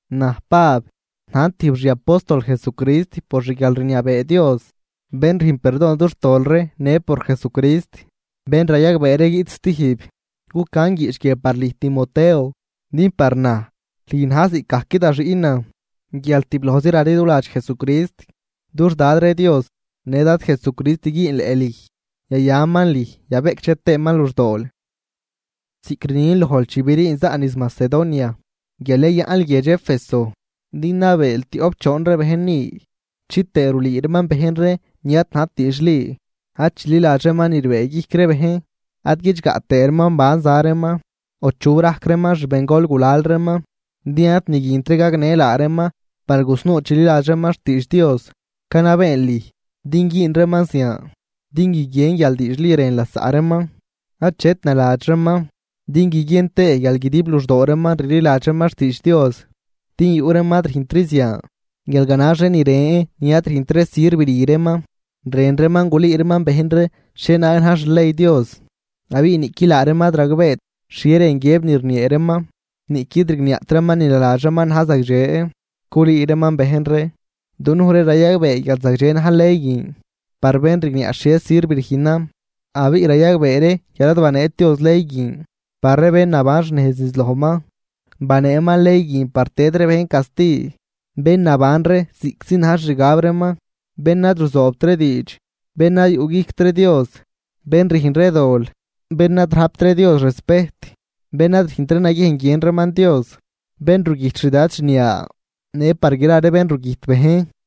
Naj Pab, najn tijb xiapóstol Jesucrist por xguialrniabee Dios bén rüjn perdon dux tol ree në por Jesucrist bén rayagbee ree guiꞌt stijb. Cucan guiꞌch guie par lüj Timoteo, din par naj lüj na̱j ziꞌcgajc da xiꞌnan guial tiblojzi raliduladx Jesucrist. Dux Dad ree Dios në Dad Jesucrist güünleꞌ lüj, yayaman lüj yabeꞌcdxe tëëman luxdool. Ziꞌc rnin lojl chi briin zaꞌn niz Macedonia, guial yayaꞌnl guiedx Éfeso din nabeel tioꞌp choon ree bejn ni chitëë rulüü reeman bejn ree ni ad najt diidxli. Ad chililadx reeman ni rbëëguijc ree bejn, ad guidxgaꞌ tëë reeman ban za reeman, o chu rajc reeman xbengol gulal reeman, din ad ni guint ree gagnë laa reeman par gusnuu chililadx reeman xtiidx Dios. Canabeen lüj din güün reeman zian din guiguien guial diidxli rën lasaꞌ reeman, achet naladx reeman din guiguien tëë guial guidib luxdoo reeman rliladx reeman xtiidx Dios. Din yuꞌ reeman ad rüjntri zian guial ganax ree ni ren ni ad rüjnt ree sirv rü reeman. Rën reeman gulüü reeman bejn ree xhienaag na̱j xley Dios, abiꞌ niꞌqui laa reeman ad ragbeet xhie rën guiëb ni rniee reeman niꞌquid rigniaꞌt reeman ni naladx reeman na̱j zagdxe culüü reeman bejn ree. Dunuj ree rayagbee guial zagdxe na̱j ley guin par bén rigniaꞌ xhie sirv rüjnan. Abiꞌ rayagbee ree guial ad baneet Dios ley guin par ree bén naban xnejz niz lojman, baneeman ley guin par tëd ree bejn casti, bén naban ree ziꞌctzi na̱j xixgab reeman, bén ad ruzoobt ree diidx, bén ad yuꞌguijct ree Dios, bén rüjn ree dol, bén ad rajpt ree Dios respejt, bén ad rüjnt ree naguiejn guiën reeman Dios, bén rugüjt xdad xniaa, në par gra ree bén rugüjt bejn,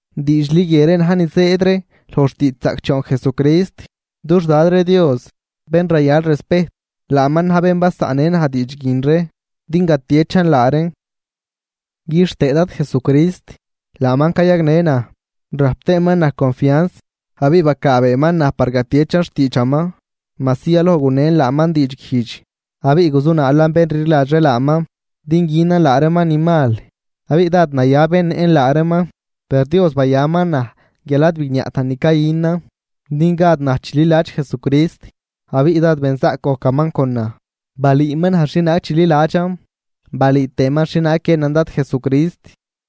Diidxli guie ree na̱j ni zëëd ree loj xtiidxzaꞌcdxoon Jesucrist. Dux Dad ree Dios, bén rayal respejt, laaman na̱j bén basaꞌnnë naj diidx guin ree din gatiechan laa reen. Quixtëë Dad Jesucrist laaman cayagnë naj, rajp tëëman naj confianz abiꞌ bacaabeeman naj par gatiechan xtiidxaman, majsi yaloj gunen laaman diidxguijdx abiꞌ guzunaalan bén rliladx ree laaman din günan laa reeman ni mal abiꞌ dád naya bennëꞌn laa reeman. Per Dios bayaman naj guial ad bigniaꞌtan ni cayünan din gad naj chililadx Jesucrist. Abiꞌ dád benzaꞌc gojcaman con naj, balüüman naj xhienaag chililadxan balüü tëëman xhienaag guiënan Dad Jesucrist.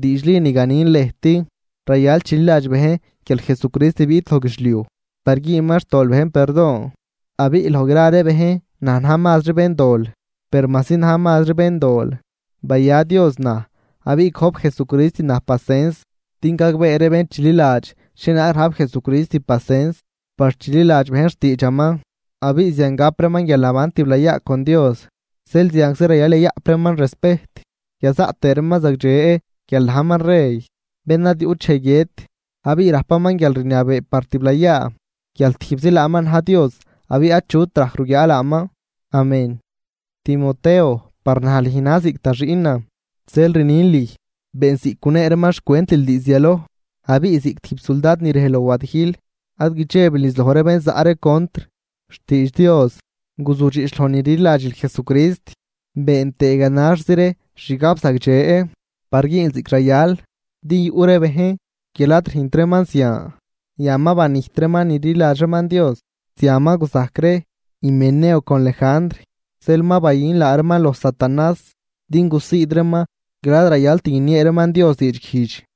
Diidxli ni ganin lëjt, rayal chililadx bejn: guial Jesucrist biꞌt loj guidxliuj par güünman xtol bejn perdon, abiꞌ loj gra ree bejn naj na̱j mazri béndol. Per majsi najn mazri béndol, baya Dios naj abiꞌ gojp Jesucrist naj pacens din gagbee ree bén chililadx xhienaag rajp Jesucrist pacens par chililadx bejn xtiidxaman, abiꞌ zian gap reeman guialnaban tiblayaa con Dios. Zeel zianczi rayal yayaꞌp reeman respejt yazaꞌt tëë reeman zagdxe guial najman rey bén ad yuꞌt dxej guiët, abiꞌ rajpaman guialrniabee par tiblayaa guial tijbzi laaman na̱j Dios abiꞌ achut rajc ruguiaa laaman. Amén. Timoteo, par naj lüj na̱j ziꞌc da xiꞌnan zeel rnin lüj been ziꞌc gunee reeman xcwentil diizd yaloj, abiꞌ ziꞌc tijb suldad ni rej loj wadijl ad guidxebil niz loj ree bén zaꞌ ree contr xtiidx Dios. Guzudxiꞌch loj ni rliladxil Jesucrist, been tëë ganaxzi ree xgab zagdxe par güünl ziꞌc rayal. Din yuꞌ ree bejn guial ad rüjnt reeman zian, yan ma banijt reeman ni rliladx reeman Dios. Zian ma guzajc ree Himeneo con Lejandr, zeel ma bayün laa reeman loj satanás din gusiid reeman guial ad rayalt guiniee reeman Dios diidguijdx.